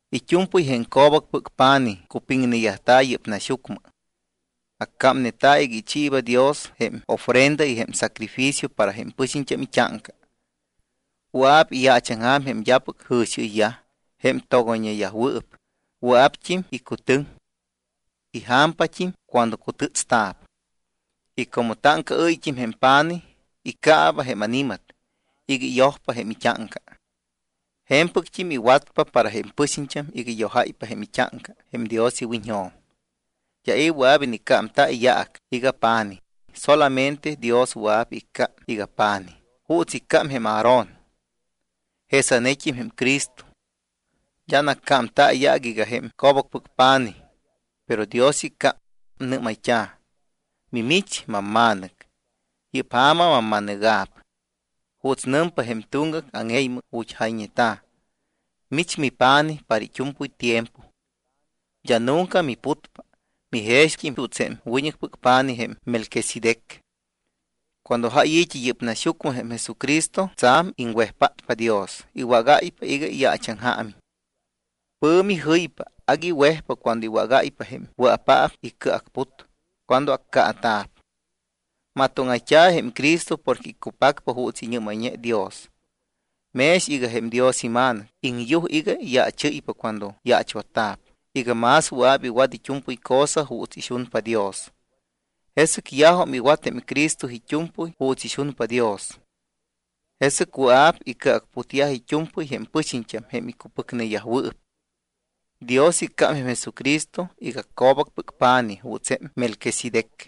It́u̱mpɨy jém co̱bacpɨc pa̱nij cupiŋneyajta̱ yɨ́p naxyucmɨ, accámneta̱ iga ichiiba Dios jém ofrenda y jém sacrificio para jém pɨxiñt́am it́áŋca. Wɨa̱p iyaachaŋja̱m jém d́apɨc jɨ̱xiɨyyaj, jém togoyñeyajwɨɨp, wɨa̱pt́im icutɨŋ. Ija̱mpat́im cuando cutɨ́tsta̱p. Y como táŋcaɨ́yt́im jém pa̱nij, iccaaba jém ani̱mat iga iyojpa jém it́áŋca, je̱mpɨct́im iwatpa para jém pɨxiñt́am iga iyojáypa jém it́áŋca jém Dios iwiñjo̱m. D́a i̱ wɨa̱p iniccámta̱ iyaac iga pa̱nij. Solamente Dios wɨa̱p iccám iga pa̱nij, juuts iccám jém Aarón. Jesanet́im jém Cristo. D́a naccámta̱ iyaac iga jém co̱bacpɨc pa̱nij, pero Dios iccám. Nɨ́mayt́a̱: Mimich mamma̱nɨc. Yɨ́p ja̱ma mamma̱nɨga̱p. Juuts nɨmpa jém tuŋgac áŋe̱ymɨ, ju̱t́ jayñeta̱: Mich mipa̱nij para it́u̱mpɨy tiempo. D́a nunca miputpa. Mijext́im juuts jém wiñɨcpɨc pa̱nij jém Melquisedec. Cuando jáy i̱t́i yɨ́p naxyucmɨ jém Jesucristo, tsa̱m iŋwejpátpa Dios, iwágáypa iga iyaachaŋjaamiñ. Pɨ̱mi jɨypa, agui wejpa cuando iwágáypa jém wɨa̱paap icɨacput cuando accaata̱p. Matóŋayt́a̱ jém Cristo porque iccupacpa juuts iñɨ́mayñe Dios. Mex iga jém Dios iMa̱nɨc, iŋyuj iga iyaachɨ́ypa cuando yaachwatta̱p iga más wɨa̱p iwat it́u̱mpɨy cosa juuts ixunpa Dios. Jesɨc yajum iwat jém Cristo it́u̱mpɨy juuts ixunpa Dios, jesɨc wɨa̱p icɨacputyaj it́u̱mpɨy jém pɨxiñt́am jém icupɨcneyajwɨɨp. Dios iccám jém Jesucristo iga co̱bacpɨc pa̱nij juuts jém Melquisedec.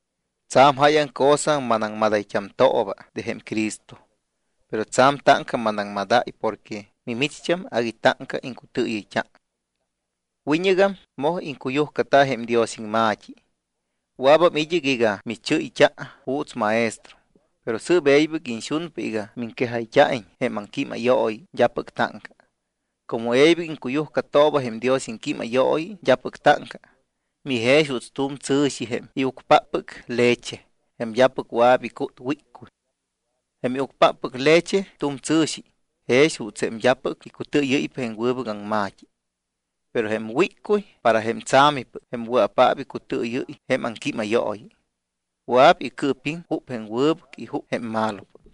Tsa̱m jáyaŋ cosa manaŋmadayt́amtooba de jém Cristo, pero tsa̱m táŋca manaŋmadáy porque mimicht́am agui táŋca iŋcutɨɨyɨyt́a. Wiñɨgam moj iŋcuyujcata jém Dios iŋma̱t́i. Wɨa̱bam id́ɨc iga michɨ́yt́a juuts maestro. Pero sɨɨp e̱ybɨc iñxunpa iga miŋquejayt́a̱iñ jém aŋquímayooyi d́apɨc táŋca. Como e̱ybɨc iŋcuyujcatooba jém Dios iŋquímayooyi d́apɨc táŋca, mijex juuts tu̱m tsɨ̱xi jém iucpáppɨc leche, jém d́apɨc wɨa̱p icút wíccuy. Jém iucpáppɨc leche tu̱m tsɨ̱xi, jex juuts jém d́apɨc icutɨɨyɨ́ypa jém wɨbɨc aŋma̱t́i. Pero jém wíccuy para jém tsa̱mipɨc, jém wɨa̱paap icutɨɨyɨ́y jém aŋquímayooyi, wɨa̱p icɨɨpiŋ jup jém wɨbɨc y jup jém malopɨc.